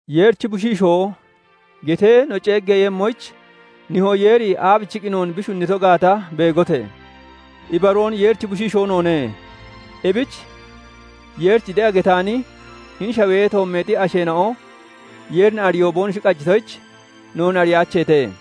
"Yeerichi bushiishoo" getee no ceeggeeyemmoyich, Nihoo Yeeri aabichiqqi noon bi shunnito gaata beegote! Ibaroon Yeerichi bushiishoo noone. Ebich Yeerich de'a getaani hini shawee toommeexi asheena'o Yeerin ariyoon boonoshi qajitoyich, noon ariyaacheete.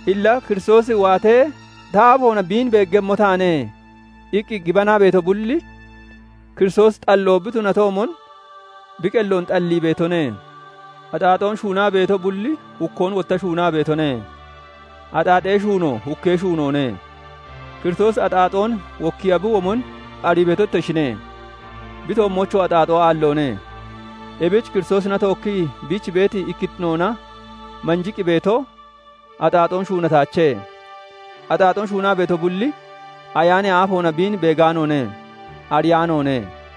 Illa "Kiristoosi waatee, ta aafoona biin beeggemmo taane" iqqi gibanaa beeto bulli, Kiristoosi xalloo bi tunatoomon bi qelloon xallii beetone. Axaaxoon shuunaa beeto bulli hukkoon wotta shuunaa beetone; axaaxee shuuno hukkee shuunoone. Kiristoosi axaaxoon wokkiya bi womon arii beeto ittoshine; bi toommoochoo axaaxoo aalloone. Ebich Kiristoosina tookkii biich beeti ikkittinoona manjiqqi beeto axaaxoon shuunataache; axaaxoon shuunaa beeto bulli, ayaanee aafoona biin beegaanoone; ariyaanoone.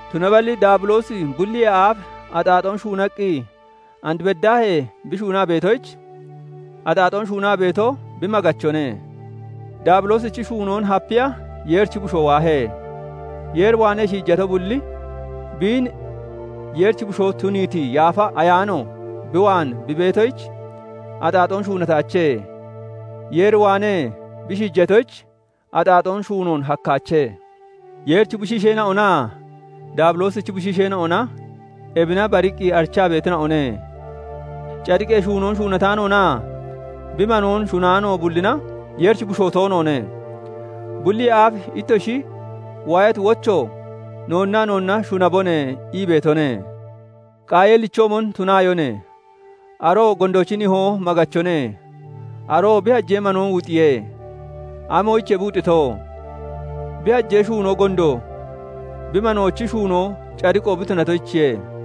Tunaballi Daabiloosi bulliyee aaf axaaxoon shuunaqqi and beddaahee bi shuunaa beetoyich, axaaxoon shuunaa beeto bi maggachone. Daabiloosichi shuunoon hapiya Yeerichi Bushoo waahe. Yeer waanee shiijato bulli biin Yeerichi bushoo tuniiti Yaafa Ayaano bi waan bi beetoyich, axaaxoon shuunataache. Yeer waanee bi shiijatoyich, axaaxoon shuunoon hakkaache. Yeerichi bushiisheena'onaa Daabiloosichi bushiisheena'ona ebina bariqqi arichaa beetina'one; cadiqee shuunoon shuunataanoonaa bi manoon shunaano bullina Yeerichi bushoo toonoone. Bulliyee aaf ittoshi waayati wocho "Noonnaa noonna shunabone" ii beetone. Qaayeelichoomon tunaayone; aroo gondoochi nihoo maggachone; aroo bi hajee manoon wuxiye. Amoyichiye bi wuxito? Bi hajee shuunoo gondo, bi manoochi shuunoo cadiqo bi tunatoyichiye.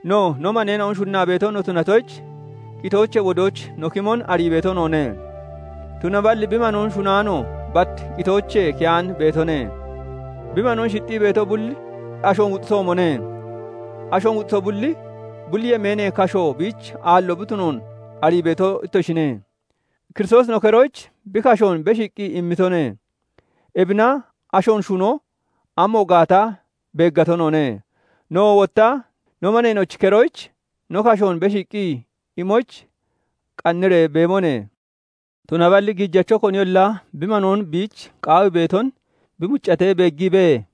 No, no maneena'on shunnaa beeto no tunatoyich, qitoochee wodooch no kimon arii beeto noone; tunaballi bi manoon shunaano bat qitoochee keyaan beetone. Bi manoon shixxii beeto bulli ashoon wuxitoomone; ashoon wuxito bulli, bulli yemeenee kasho biich aallo bi tunoon arii beeto ittoshine. Kiristoosi no keroyich bi kashoon beshiiqqi immitone; ebina ashoon shuno amo gaata beeggato noone. Nowoo wotta no maneena'ochi keroyich no kashoon beshiiqqi imoyich qanniree beebone. Tunaballi gijacho koniyolla bi manoo biich qaawii beeton bi muccatee beeggiibee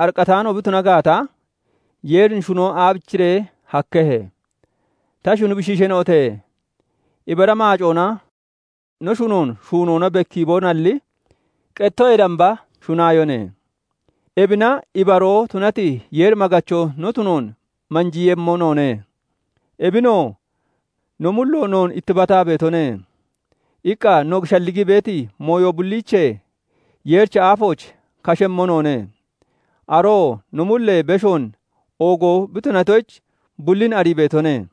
ariqqataano bi tuna gaata, Yeerin shunon aabichiree hakkehe? Ta shuni bushiisheena'ote! Ibara maacoona no shunoon shuunoona bekkiibonalli, qettoyee damba shunaayone. Ebina ibaroo tunati Yeer maggacho no tunoon manjiiyemmo noone; ebinoo "No mullo noon ittibataa beetone" iqqa no shalligii beeti mooyo bulliichee Yeerichi aafooch kashemmo noone. Aroo no mulloyee beshoon oogoo bi tunatoyich, bullin arii beetone.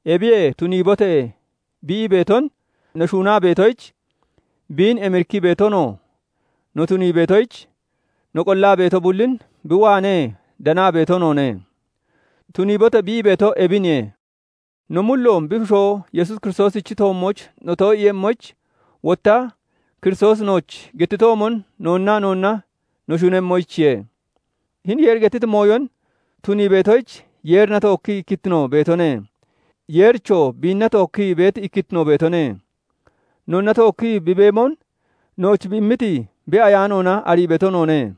Ebiyee "Tuniibote!" bi ii beeton no shuunaa beetoyich, biin emirikkii beetonoo no tunii beetoyich, no qollaa beeto bullin bi waanee danaa beeto noone. "Tuniibote!" bi ii beeto ebine; no mulloon bi Bushoo Yesuus Kiristoosichi toommooch no too'iiyemmoyich, wotta Kiristoosi nooch gettitoomon noonnaa noonna no shunemmoyichiye. Hini Yeeri gettiti mooyon tunii beetoyich Yeerina tookkii ikkittino beetone; Yeerichoo biinna tookkii ikkittino beetone. Noonna tookkii bi beemon nooch bi immiti bi Ayaanoona arii beeto noone.